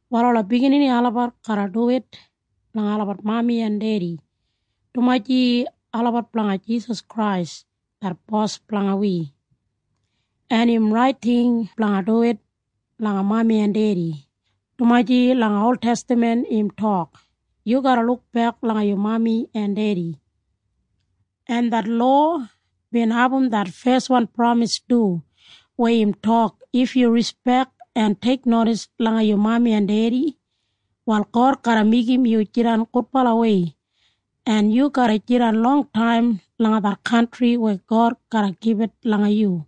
Wal ola bigininimob garra duwit langa olabat mami en dedi, dumaji olabat blanga Jisas Krais det Bos blanga wi, en im rait ting blanga duwit langa mami en dedi, dumaji langa oltestaman im tok, “Yu garra lukbek langa yu dedi en mami.” En det lowa bin abum det feswan pramis du weya im tok, “If yu rispek en teiknodis langa yu mami en dedi, wal God garra meigim yu jidan gudbalawei, en yu garra jidan longtaim langa det kantri weya God garra gibit langa yu.”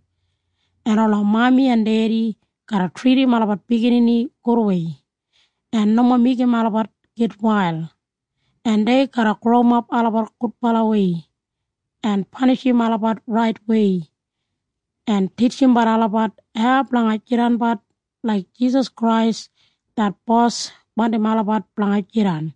En ola mami en dedi garra tridim olabat biginini gudwei en nomo meigim olabat gitwail, en dei garra growimap olabat gudbalawei en panishim olabat raitwei en titjimbat olabat hau blanga jidanbat laik Jisas Krais det Bos wandim olabat blanga jidan.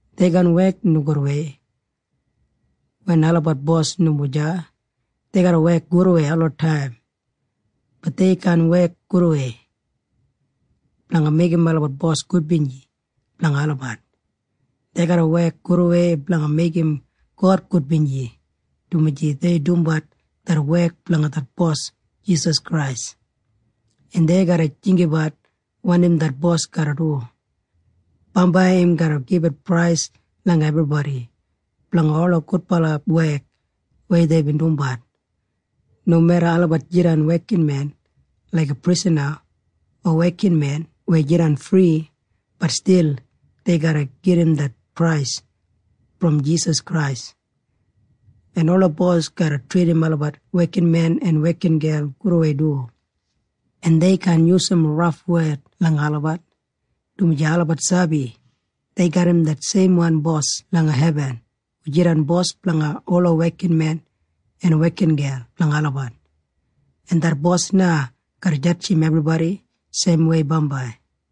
Dei kaan wek nogudwei wen olabat bos nomo deya. Dei garra wek gudwei olataim. Bat dei kaan wek gudwei blanga meigim olabat bos gudbinji blanga olabat. Dei garra wek gudwei blanga meigim God gudbinji, dumaji dei dumbat det wek blanga det Bos Jisas Krais, en dei garra jinggabat wanim det bos garra du. Bambai im garra gibit prais langa ebribodi blanga ola gudbala wek weya deibin dumbat. Nomeda olabat jidan wekinmen laiga prisana o wekinmen weya jidan fri, bat stil dei garra gedim det prais brom Jisas Krais. En ola bos garra tridim olabat wekinmen en wekingel gudwei du, en dei kaan yusum raf wed langa olabat, dumaji olabat sabi dei garram det seimwan Bos langa hebin hu jidan bos blanga ola wekinmen en wekingel blanga olabat, en det Bos na garra jadjim ebribodi seimwei bambai.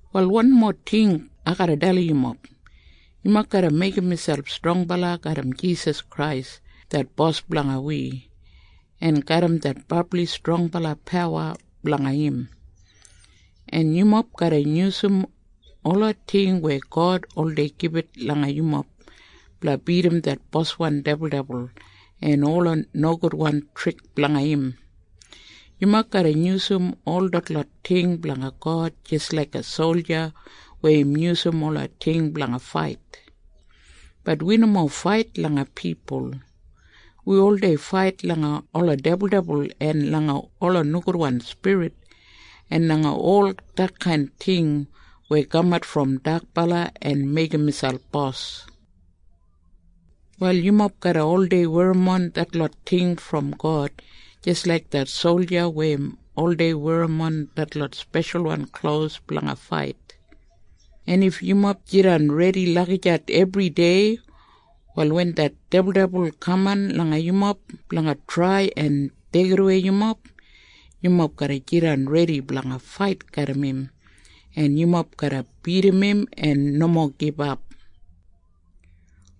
Wal wanmo ting ai garra dalim yumob. Yumob garra meigim miselp strongbala garram Jisas Krais det Bos blanga wi en garram det brabli strongbala pawa blanga im, en yumob garra yusum ola ting weya God oldei gibit langa yumob blanga bidim det boswan dibuldibul en ola nogudwan trik blanga im. Yumob garra yusum ol detlot ting blanga God jis laiga solja weya im yusum ola ting blanga fait. Bat wi nomo fait langa pipul. Wi oldei fait langa ola dibuldibul en langa ola nogudwan spirit en langa ol detkain ting weya kamat brom dakbala en meigim miselp bos. Wal yumob garra oldei werrimon detlot ting brom God jis laik det solja weya im oldei werrimon detlot speshalwan klos blanga fait, en if yumob jidan redi lagijat ebridei, wal wen det dibuldibul kaman langa yumob blanga trai en deigidawei yumob, yumob garra jidan redi blanga fait garram im, en yumob garra bidim im en nomo gibap.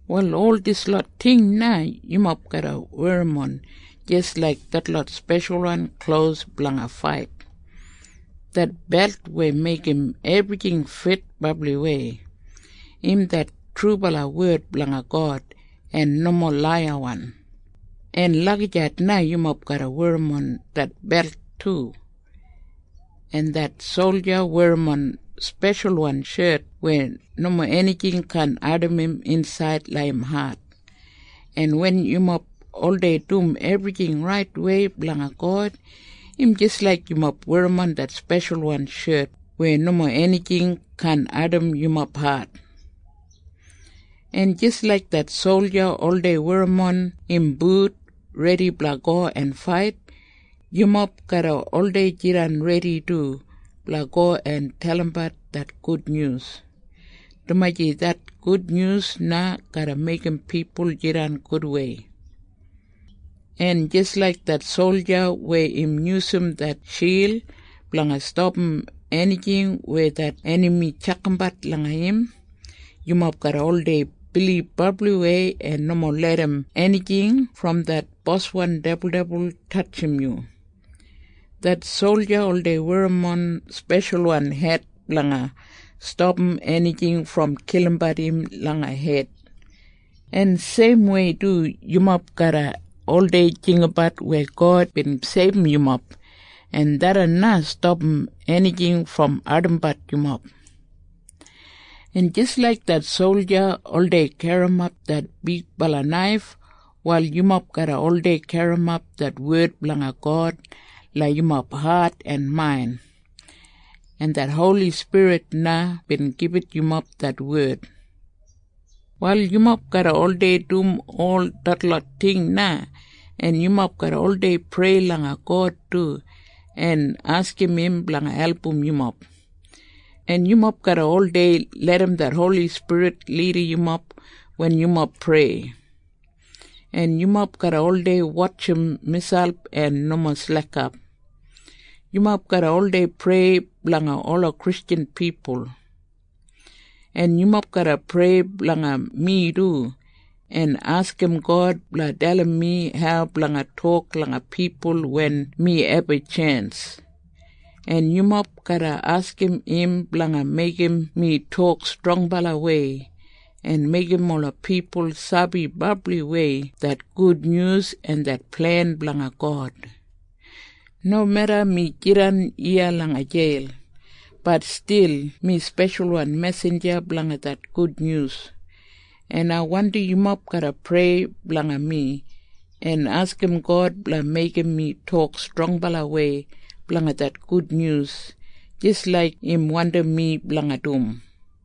Wal ol dislot ting na yumob garra werrimon jis laik detlot speshalwan klos blanga fait. Det belt weya meigim ebrijing fit brabliwei, im det trubala wed blanga God en nomo laiyawan, en lagijat na yumob garra werrimon det belt du. En det solja werrimon speshalwan shet weya nomo enijing kaan ardim im insaid langa im hat. En wen yumob oldei dum ebrijing raitwei blanga God, im jis laik yumob werrimon det speshalwan shet weya nomo enijing kaan ardim yumob hat. En jis laik det solja oldei werrimon im but redi blanga go en fait, yumob garra oldei jidan redi du blanga go en dalimbat det Gudnyus, dumaji det Gudnyus na garra meigim pipul jidan gudwei. En jis laik det solja weya im yusum det shild blanga stapam enijing weya det enami tjakambat langa im, yumob garra oldei bilib brabliwei en nomo larram enijing brom det boswan dibuldibul tatjim yu. Det solja oldei werrimon speshalwan het blanga stapam enijing brom kilimbat im langa hed. En seimwei du yumob garra oldei jinggabat weya God bin seibum yumob, en tharran na stapam enijing brom ardimbat yumob. En jis laik det solja oldei garrimap det bigbala naif, wal yumob garra oldei garrimap det wed blanga God langa yumob hat en main. En det Holi Spirit na bin gibit yumob det wed. Wal yumob garra oldei dum ol detlot ting na, en yumob garra oldei prei langa God du en askim im blanga album yumob. En yumob garra oldei larram det Holi Spirit lidim yumob wen yumob prei. En yumob garra oldei wotjim miselp en nomo slekap. Yumob garra oldei prei blanga ola Kristjan pipul. En yumob garra prei blanga mi du, en askim God blanga dalim mi hau blanga tok langa pipul wen mi abum tjens. En yumob garra askim im blanga meigim mi tok strongbalawei en meigim ola pipul sabi brabliwei det gudnyus en det plen blanga God. Nomeda mi jidan iya langa jeil, bat stil mi speshalwan mesinja blanga det gudnyus. En ai wandim yumob garra prei blanga mi, en askim God blanga meigim mi tok strongbalawei blanga det gudnyus, jis laik im wandim mi blanga dum.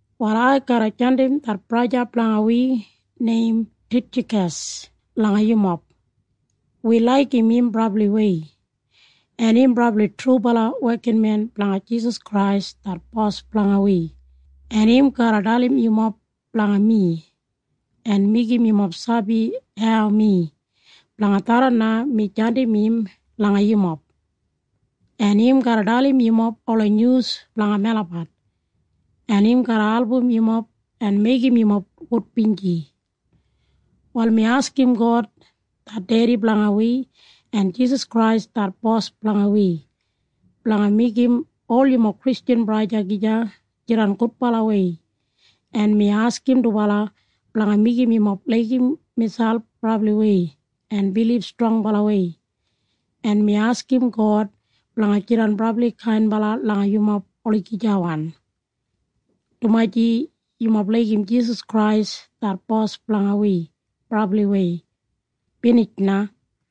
Wal ai garra jandim det braja blanga wi neim Titjakas langa yumob. Wi laigim im brabliwei, en im brabli trubala wekinmen blanga Jisas Krais det Bos blanga wi, en im garra dalim yumob blanga mi en meigim yumob sabi hau mi. Blanga tharran na mi jandim im langa yumob, en im garra dalim yumob ola nyus blanga melabat, en im garra album yumob en meigim yumob gudbinji. Wal mi askim God det Dedi blanga wi, en Jisas Krais det Bos blanga wi, blanga meigim ol yumob Kristjan braja en sista gija jidan gudbalawei. En mi askim dubala blanga meigim yumob laigim gija brabliwei en bilib strongbalawei. En mi askim God blanga jidan brabli kainbala langa yumob olagijawan, dumaji yumob laigim Jisas Krais det Bos blanga wi brabliwei. Binij na.